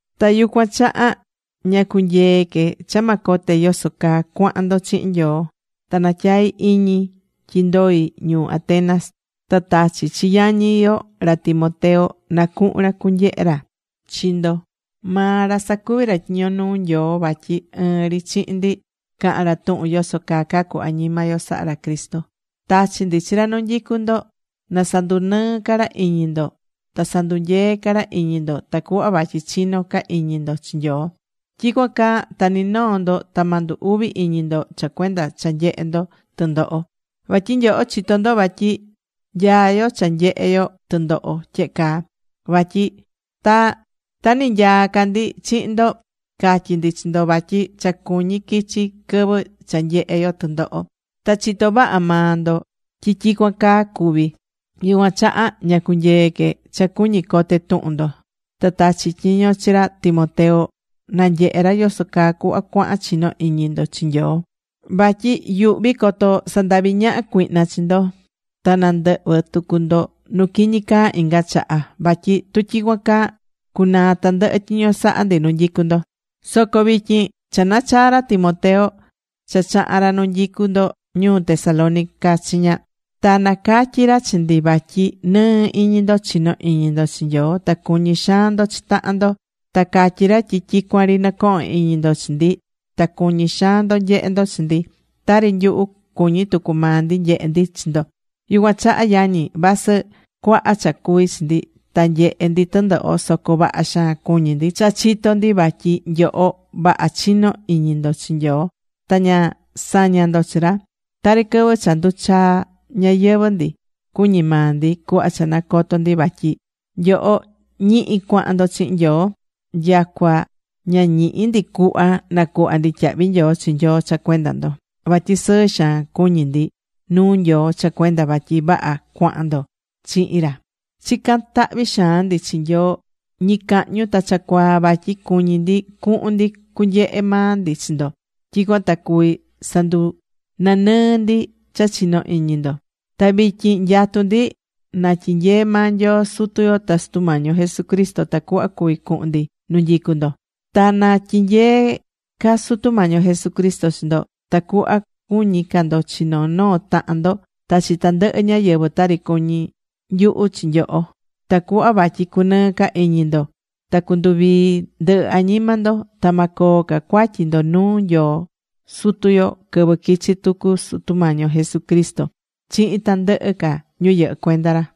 Ta yucuan chaha ña cunyee̱ que cha ma cote yoso caa cuahan ndo chihin Nyoo. Ta natyai̱ iñi tyi ndoi̱ ñuu Atenas. Ta tachi̱ chi yañi yo ra Timoteo na cuhun ra cunyehe ra chi ndo. Maa ra sacuví ra tyiño nuu Nyoo vatyi ɨɨn ri chihin ndi cahán ra tuhun yoso caa cacú añima yo sahá ra Cristo. Tachi̱ ndi chi ra nu nyicú ndo na sandunɨɨ ca ra iñi ndo ta sandunyee ca ra iñi ndo tacuhva vatyi chinó ca iñi ndo chi Nyoo. Tyicuan caa ta ni noo ndo ta ma ndu uvi iñi ndo cha cuenda cha nyehé ndo tɨndoho. Vatyi nyoho chitó ndo vatyi nyaá yo cha nyehe yo tɨndoho tyehe caa. Vatyi ta ninyaá ca ndi chihin ndo, catyi̱ ndi chi ndo vatyi cha cuñí quichi quɨvɨ cha nyehé yo tɨndoho. Ta chitó vaha maa ndo tyi tyicuan caa cuvi̱. Yucuan chaha ña cunyee̱ que cha cuñí cote tuhun ndo. Ta tachi̱ tyiño chihin ra Timoteo na nyehe ra yoso caa cuhva cuahan chinó iñi ndo chi Nyoo. Vatyi yuhví coto sandavi ñaha cuihna chi ndo ta nandɨhvɨ tucu ndo nu quiñi caa inga chaha. Vatyi tu tyicuan caa, cucunaa tandɨhɨ tyiño saha̱ ndi nu nyicú ndo. Soco vityin cha nachaa̱ ra Timoteo cha chaha̱n ra nu nyicú ndo ñuu Tesalónica chiña. Ta nacatyi̱ ra chi ndi vatyi nɨɨ́ iñi ndo chinó iñi ndo chi Nyoo. Ta cuñí xaan ndo chi tahan ndo. Ta catyí ra tyi tyicuan ri nɨcohón iñi ndo chi ndi ta cuñí xaan ndo nyehe ndo chi ndi, tari nyuhu, cuñí tucu maa ndi nyehe ndi chi ndo. Yucuan chaha, yañi, vasɨ cuaha cha cuví chi ndi ta nyehé ndi tɨndoho, soco vaha xaan cuñí ndi cha chitó ndi vatyi nyoho vaha chinó iñi ndo chi Nyoo ta ña sañá ndo chi ra. Tari quɨvɨ cha nduchaa̱ ñayɨvɨ̱ ndi, cuñí maa ndi cuhva cha nacoto̱ ndi vatyi nyoho ñihi cuahan ndo chihin Nyoo. Nyacua ña ñihí ndi cuhva nacuhva ndi tyahvi nyoo chi Nyoo cha cuenda ndo. Vatyi sɨɨ xaan cuñí ndi nuu Nyoo cha cuenda vatyi vaha cuahan ndo chihin ra. Chicán tahvi xaan ndi chi Nyoo ñicahñu ta cha cuaa, vatyi cuñí ndi cuhun ndi cunyehe maa ndi chi ndo. Tyicuan ta cuvi sandunanɨɨ ndi cha chinó iñi ndo. Ta vityin nyatú ndi na tyinyee maa Nyoo Sutu yo ta Sutu Mañi yo Jesucristo tacuhva cuvi cuhun ndi nu nyicú ndo. Ta na tyinyee ca Sutu Mañi yo Jesucristo chi ndo tacuhva cuñí ca ndo chi noo noo tahan ndo ta chi tandɨhɨ ñáyɨvɨ tari cuñí nyuhu chi nyoho. Tacuhva vatyi cunɨɨ ca iñi ndo ta cunduvii ndɨhɨ añima ndo. Ta ma coo ca cuatyi ndo nuu Nyoo Sutu yo quɨvɨ quichi tucu Sutu Mañi yo Jesucristo chihin tandɨhɨ ca ñu yɨhɨ́ cuenda ra.